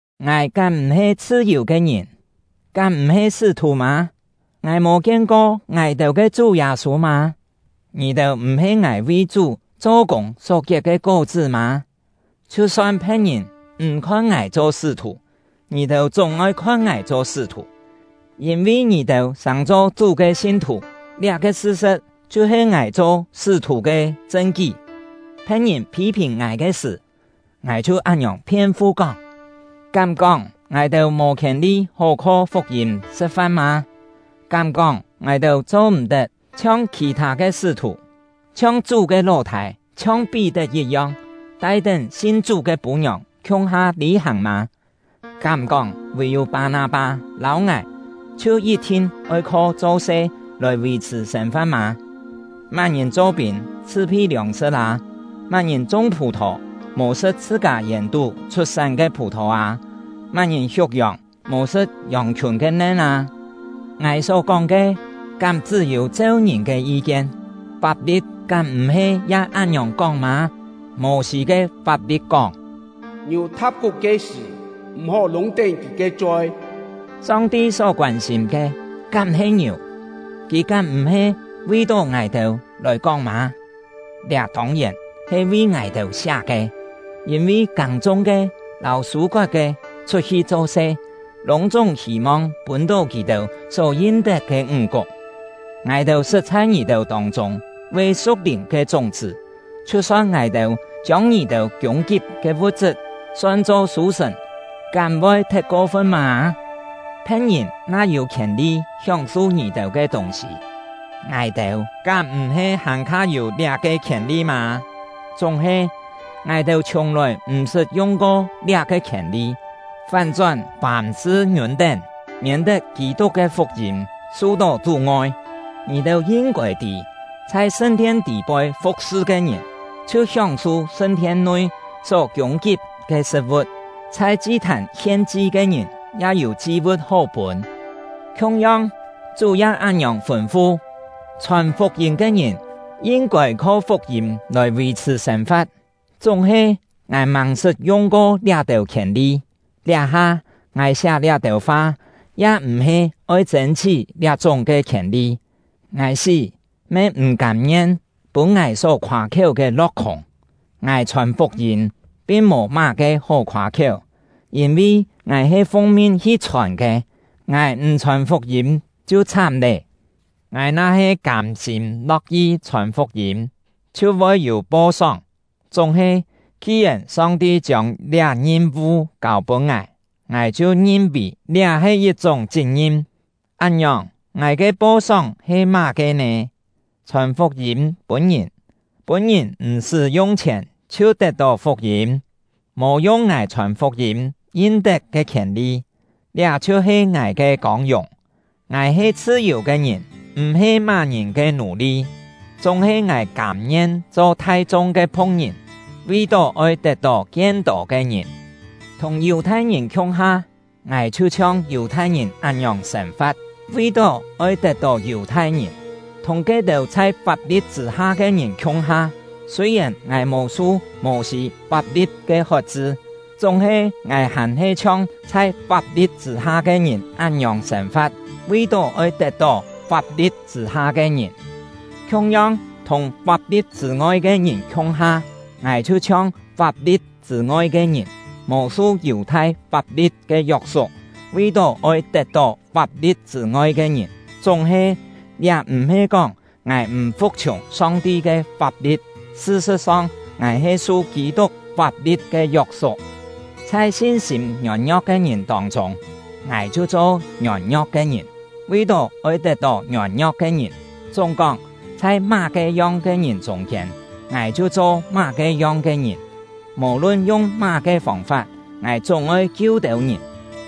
Ngài kám m̀-he chhṳ-yù ke ngìn? Kám m̀-he sṳ́-thù mâ? Ngài mò kien-ko ngài-têu ke Chú Yâ-sû mâ? Ngì-têu m̀-he ngài vi Chú cho-kûng só kiet ke kó-chṳ́ mâ? Chhiu-son phe̍t-ngìn m̀ khon ngài cho sṳ́-thù, ngì-têu chúng-oi khon ngài cho sṳ́-thù! Yîn-vi ngì-têu sàng-cho Chú ke sin-thù, liá-ke sṳ-sṳ̍t chhiu-he ngài cho sṳ́-thù ke chṳn-kí. Phe̍t-ngìn phî-phìn ngài ke sṳ̀, ngài chhiu án-ngiòng phien-fu kóng: Kám-kóng ngài-têu mò khièn-li hó kho fuk-yîm sṳ̍t-fan mâ? Kám-kóng ngài-têu cho-m̀-tet chhiong khì-thâ ke sṳ́-thù, chhiong Chú ke ló-thâi, chhiong Pí-tet yit-yong, tai-tén sin Chú ke pû-ngiòng khiung-ha lî-hàng mâ? Kám-kóng vì-yû Pâ-nâ-pâ lâu ngài chhiu yit-thin oi kho cho-se lòi vì-chhṳ̀ sên-fa̍t mâ? Má-ngìn cho-pîn chhṳ-phi liòng-sṳ̍t â? Má-ngìn chung phù-thò mò sṳ̍t chhṳ-kâ yèn-tú chhut-sán ke phù-thò â? Má-ngìn hiuk yòng mò sṳ̍t yòng-khiùn ke nen â? Ngài só-kóng ke, kám chṳ́-yû cheu ngìn ke yi-kien; fap-li̍t kám m̀-he ya án-ngiòng kóng mâ? Mô-sî ke fap-li̍t kóng: “Ngiù tha̍p kuk ke sṳ̀, m̀-hó lûng-tén kì ke choi.” Song-ti só koân-sîm ke kám-he ngiù? Kì kám m̀-he vi-tó ngài-têu lòi kóng mâ? Liá tông-yèn he vi ngài-têu siá ke! Yîn-vi kâng-chung-ke lâu sû-kot-ke chhut-hi cho-se, lûng-chúng hî-mong pûn-tó kì-têu só yin-tet ke ńg-kuk. Ngài-têu sṳt chhai ngì-têu tông-chûng ve su̍k-lìn ke chúng-chṳ́. Chhiu-son ngài-têu chiông ngì-têu kiûng-kip ke vu̍t-chṳt son-cho sû-sṳ̀n, kám voi thet ko-fun mâ? Phe̍t-ngìn na yû khièn-li hióng-su ngì-têu ke tûng-sî, ngài-têu kám m̀-he hàn-kha yû liá-ke khièn-li mâ? Chúng-he, ngài-têu chhiùng-lòi m̀-sṳt yung-ko liá-ke khièn-li, fán-chón fàm-sṳ ngiûn-tén, miên-tet Kî-tuk ke fuk-yîm su-tó chú-ngoi. Ngì-têu yin-kôi tî, chhai sṳn-thien tî-poi fu̍k-sṳ ke ngìn chhiu hióng-su sṳn-thien-nui só kiûng-kip ke sṳ̍t-vu̍t; chhai chi-thàn hien-chi ke ngìn ya yû chi-vu̍t hó pûn. Khiung-yong, Chú ya án-ngiòng fûn-fu: Chhòn fuk-yîm ke ngìn yin-kôi kho fuk-yîm lòi vì-chhṳ̀ sên-fa̍t. Chúng-he, ngài màng-sṳt yung-ko liá-têu khièn-li; liá-ha, ngài siá liá-têu fa ya m̀-he oi chên-chhí liá-chúng ke khièn-li. Ngài sí me m̀ kâm-ngien pûn ngài só khoâ-khiéu ke lo̍k-khûng! Ngài chhòn fuk-yîm pin mò má-ke hó khoâ-khiéu, yîn-vi ngài he fung-min hi chhòn ke. Ngài m̀ chhòn fuk-yîm chhiu chhám lé! Ngài na-he kâm-sîm lo̍k-yi chhòn fuk-yîm, chhiu voi yû po-sóng; chúng-he, ki-yèn Song-ti chiông liá ngim-vu kâu-pûn ngài, ngài chhiu ngin-vì liá he yit-chúng chit-ngim. Án-ngiòng, ngài ke po-sóng he má-ke nè? Chhòn fuk-yîm pûn ngìn, pûn ngìn m̀-sṳ́ yung chhièn chhiu tet-tó fuk-yîm, mò yung ngài chhòn fuk-yîm yin-tet ke khièn-li, liá chhiu-he ngài ke kông-yùng. Ngài he chhṳ-yù ke ngìn, m̀-he má-ngìn ke nù-li; chúng-he ngài kâm-ngien cho thai-chung ke phu̍k-ngìn, vi-tó oi tet-tó kien-tô ke ngìn. Thùng Yù-thai-ngìn khiung-ha, ngài chhiu chhiong Yù-thai-ngìn án-ngiòng sên-fa̍t, vi-tó oi tet-tó Yù-thai-ngìn; thùng ke-têu chhai fap-li̍t chṳ̂-ha ke ngìn khiung-ha, sûi-yèn ngài mò su Mô-sî fap-li̍t ke hot-chṳ, chúng-he ngài hàn-he chhiong chhai fap-li̍t chṳ̂-ha ke ngìn án-ngiòng sên-fa̍t, vi-tó oi tet-tó fap-li̍t chṳ̂-ha ke ngìn. Khiung-yong, thùng fap-li̍t chṳ̂ ngoi ke ngìn khiung-ha, ngài chhiu-chhiong fap-li̍t chṳ̂ ngoi ke ngìn, mò su Yù-thai fap-li̍t ke yok-suk, vi-tó oi tet-tó fap-li̍t chṳ̂ ngoi ke ngìn. Chúng-he, liá m̀-he kóng ngài m̀ fu̍k-chhiùng Song-ti ke fap-li̍t; sṳ-sṳ̍t-song, ngài he su Kî-tuk fap-li̍t ke yok-suk. Chhai sin-sîm ngiôn-ngio̍k ke ngìn tông-chûng, ngài chhiu cho ngiôn-ngio̍k ke ngìn, vi-tó oi tet-tó ngiôn-ngio̍k ke ngìn. Chúng-kóng, chhai má-ke yong ke ngìn chûng-kiên, ngài chhiu cho má-ke yong ke ngìn; mò-lun yung má-ke fông-fap, ngài chúng-oi kiu têu ngìn.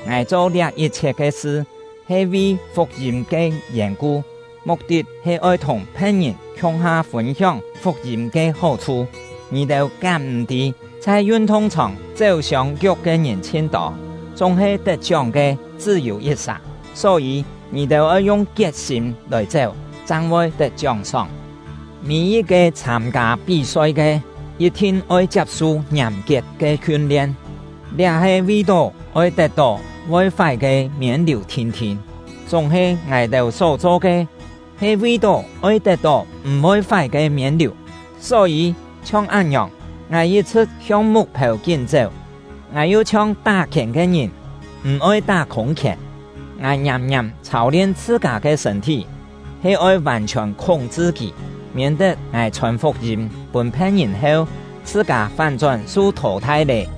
Ngài cho liá yit-chhiet ke sṳ, he vi fuk-yîm ke yèn-ku, muk-tit he oi thùng phe̍t-ngìn khiung-ha fûn-hióng fuk-yîm ke hó-chhu. Ngì-têu kám m̀-tî, chhai yun-thung-chhòng chéu-siông-kiuk ke ngìn chhin-tô, chúng-he tet-chióng ke chṳ́-yû yit-sà. Só-yî, ngì-têu oi yung kiet-sîm lòi chéu, chang voi tet chióng-sóng. Mî-yit-ke chhâm-kâ pí-soi ke, yit-thin oi chiap-su ngiàm-kiet ke hiun-lien, liá he vi-tó oi tet-tó voi fái ke miên-liù thin-thin; chúng-he ngài-têu só-cho ke he vi-tó oi tet-tó m̀-voi fái ke miên-liù. Só-yî, chhiong án-ngiòng, ngài yit-chhṳ̍t hiong muk-phêu kín-chéu; ngài yu chhiong tá-khièn ke ngìn, m̀-oi tá khûng-khièn. Ngài ngiàm-ngiàm chhâu-lien chhṳ-kâ ke sṳ̂n-thí, he oi vàn-chhiòn khúng-chṳ kì, miên-tet ngài chhòn fuk-yîm pûn phe̍t-ngìn heu, chhṳ-kâ fán-chón su thò-thai lê.